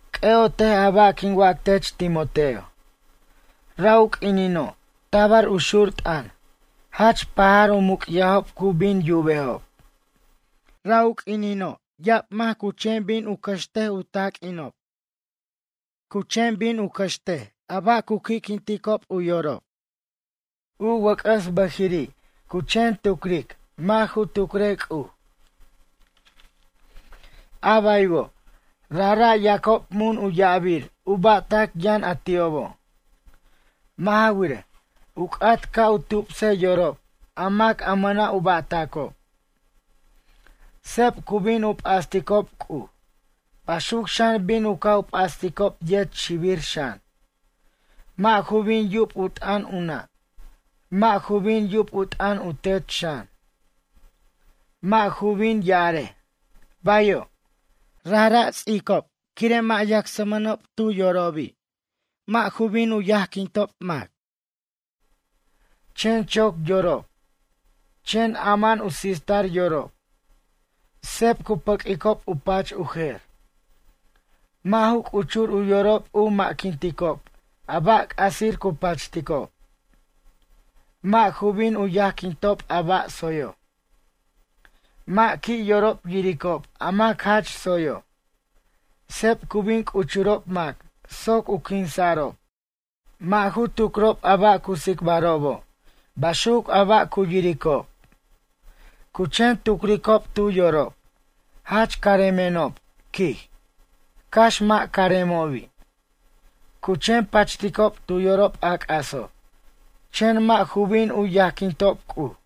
C'ʌ'otej a ba' quin wac tech Timoteo. Ra' u q'uinino' tabar u xur t'ʌn jach pajar u muc'yajob cu bin yubejob. Ra' u q'uinino' ya'ab mac cu chen bin u cʌxt u taq'uinob. Cu chen bin u cʌxt a ba' cu qui'quinticob u yorob. U wʌc'ʌs bʌjiri' cu chen tucric mʌ' ju tucrej C'uj. A baywo' rajra' yacob mun u ya'abir u ba'tac yʌn a ti'obo'. Mʌ' ja wirej, u c'at ca' u tubsej yorob a mac a mʌna' u ba'tʌcob. Seb cu bin u p'asticob C'uj, baxuc xan bin u ca' p'asticob yet xibir xan. Mʌ' ju bin yub u t'ʌn u nʌ' mʌ' ju bin yub u t'ʌn u tet xan. Mʌ' ju bin ya'arej: “Bayo'.” Rajra' u ts'icob quire' mʌ' yacsmʌnob tu yorobi'. Mʌ' ju bin yajquintob mac. Chen choc yorob, chen ama'an u sistar yorob. Seb cu pʌq'uicob u pach u jer. Mʌ' ju c'uchur u yorob u ma'quinticob a ba' c'asir cu pachticob. Mʌ' ju bin u yajquintob a ba' tsoyo'. Mʌ' qui' yorob yiricob a mac jach tsoyo'. Seb cu bin c'uchurob mac soc u quinsa'rob. Mʌ' ju tucrob a ba' cu tsicbarobo' baxuc a ba' cu yiricob. Cu chen tucricob tu yorob: “Jach caremenob”, quij, cax mʌ' caremobi'. Cu chen pachticob tu yorob a c'aso', chen mʌ' ju bin u yajquintob C'uj.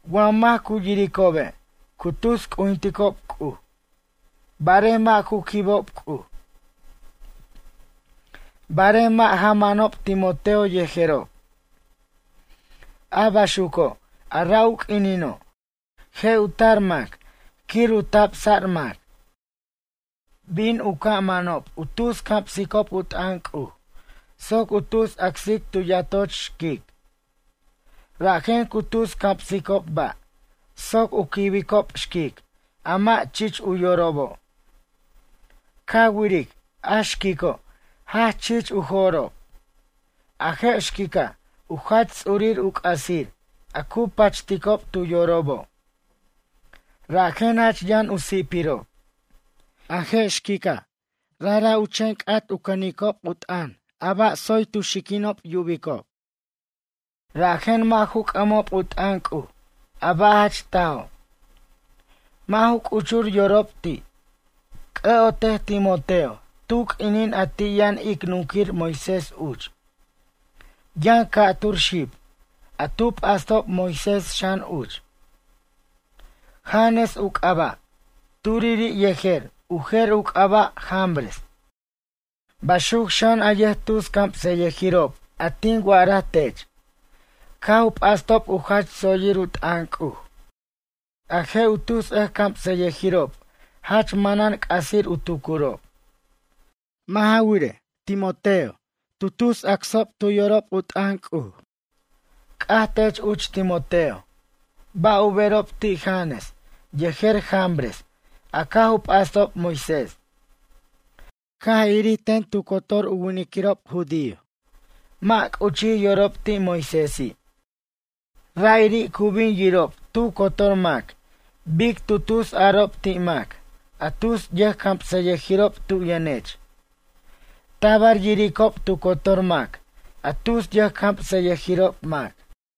Wa mac cu yiricobe' cu tus c'ujinticob C'uj. Barej mʌ' ju quibob C'uj. Barej mʌ' ja manob Timoteo yejerob. A baxuco' a ra' u q'uinino', je' u tar mac quir u tabsa'r mac. Bin u ca' manob u tus camsicob u t'ʌn C'uj soc u tus acsic tu yatoch xquic. Rajen cu tus camsicob ba' soc u quibicob xquic a mʌ' chich u yorobo'. Ca wiric a xquico' jach chich u jo'rob. A je' xquica' u jach ts'urir u c'asir a cu pachticob tu yorobo'. Rajen jach yʌn u si'pirob. A je' xquica', rajra' u chen c'at u cʌnicob u t'ʌn a ba' tsoy tu xiquinob. Yubicob rajen mʌ' ju c'ʌmob u t'ʌn C'uj a ba' jach tajo'. Mʌ' ju c'uchur yorob ti'. C'ʌ'otej Timoteo tu q'uinin a ti' yʌn ic nunquir Moisés uch. Yʌn ca'tur xib, a tu p'astob Moisés xan uch. Janes u c'aba' turiri', yejer u jer u c'aba' Jambres. Baxuc xan a yʌjtus camsʌyʌjirob a tin wa'araj tech, caj u p'astob u jach tsoyir u t'ʌn C'uj. A je' u tus ʌjcamsʌyʌjirob jach manan c'asir u tucurob. Mʌ' ja wirej, Timoteo, tu tus acsob tu yorob u t'ʌn C'uj. C'aj tech uch Timoteo, ba' u berob ti' Janes yejer Jambres a caj u p'astob Moisés? Caj irir ten tu cotor u winiquirob judío mʌ' c'uchij yorob ti' Moisési'. Ra'iri' cu bin yirob tu cotor mac bic tu tusarob ti' mac a tus yʌjcamsʌyʌjirob tu yʌnech. Tabar yiricob tu cotor mac a tus yʌjcamsʌyʌjirob mac.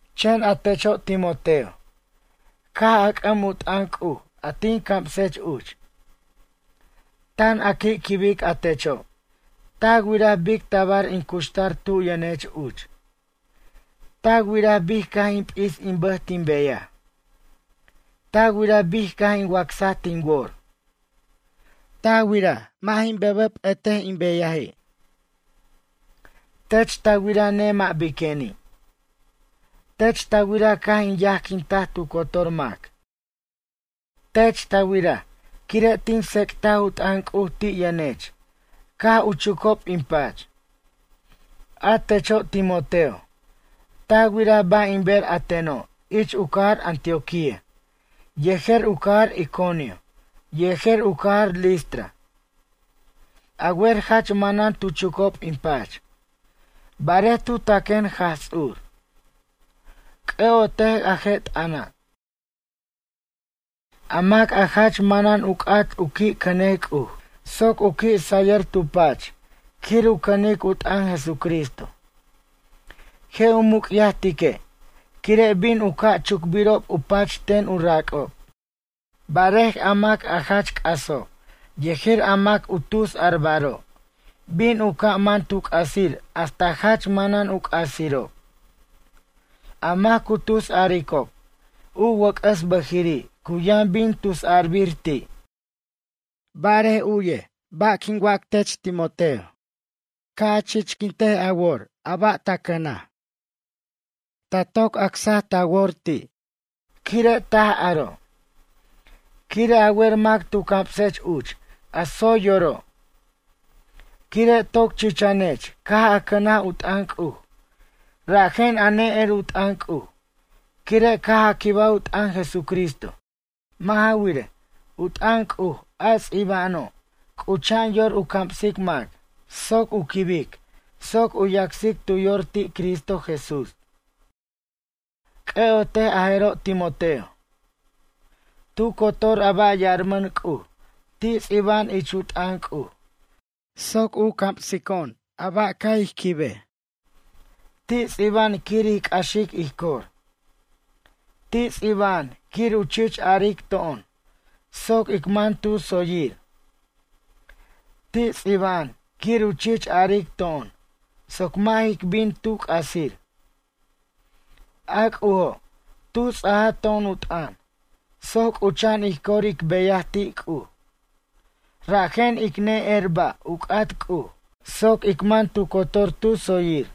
Chen a techo' Timoteo, caj a c'ʌm u t'ʌn C'uj a tin camsech uch. Tan a qui' quibic a techo'. Ta wiraj bic tabar in cuxtar tu yʌnech uch. Ta wiraj bic caj in p'is in bʌj tin beyaj. Ta wiraj bic caj in wacsaj tin wor. Ta wiraj mʌ' jin bʌbʌ p'ʌte in beyaji'. Tech ta wira nemʌ' biqueni'. Tech ta wira caj in yajquintaj tu cotor mac. Tech ta wiraj quire' tin tsec'taj u t'ʌn C'uj ti' yʌnech caj u chucob in pach. A techo' Timoteo, ta wiraj ba' in ber a teno' ich u cajar Antioquia yejer u cajar Iconio yejer u cajar Listra. A wer jach manan tu chucob in pach. Barej tu taquen Jaj Ts'ur. C'ʌ'otej a je' t'ʌna'. A mac a jach manan u c'at u qui' cʌnej C'uj soc u qui' sayʌr tu pach quir u cʌnic u t'ʌn Jesucristo. Je' u muc'yajtique', quire' bin u ca' chucbirob u pach ten u rac'ob. Barej a mac jach c'aso' yejer a mac u tusarbaro', bin u ca' man tu c'asir hasta jach manan u c'asirob. A mac cu tusaricob, u wʌc'ʌs bʌjiri' cu yʌn bin tusarbir ti'. Barej u'yej bar quin wac tech Timoteo. Ca' a chichquint a wor a ba' ta cʌnaj. Ta toc acse ta wor ti', quire' taj aro'. Quire' a wer mac tu camsech uch a tsoy yoro'. Quire' toc chichanech caj a cʌnaj u t'ʌn C'uj, rajen a ne'er u t'ʌn C'uj quire' caj a quibaj u t'ʌn Jesucristo caj. Mʌ' ja wirej, u t'ʌn C'uj a ts'iba'ano', c'ucha'an yor u camsic mac soc u quibic soc u yacsic tu yor ti' Cristo Jesús. C'ʌ'ot a jero' Timoteo. Tu cotor a ba' yarmʌn C'uj ti' ts'iba'an ich u t'ʌn C'uj soc u camsico'on a ba' ca' ij quibej. Ti' ts'iba'an quir ij c'axic ij cor. Ti' ts'iba'an quir u chich aric to'on soc ic man tu tsoyir. Ti' ts'iba'an quir u chich aric to'on soc mʌ' jic bin tu c'asir. A C'ujo' tu ts'aj to'on u t'ʌn, soc c'ucha'an ij cor ic beyaj ti' C'uj. Rajen ic ne'er ba' u c'at C'uj soc ic man tu cotor tu tsoyir.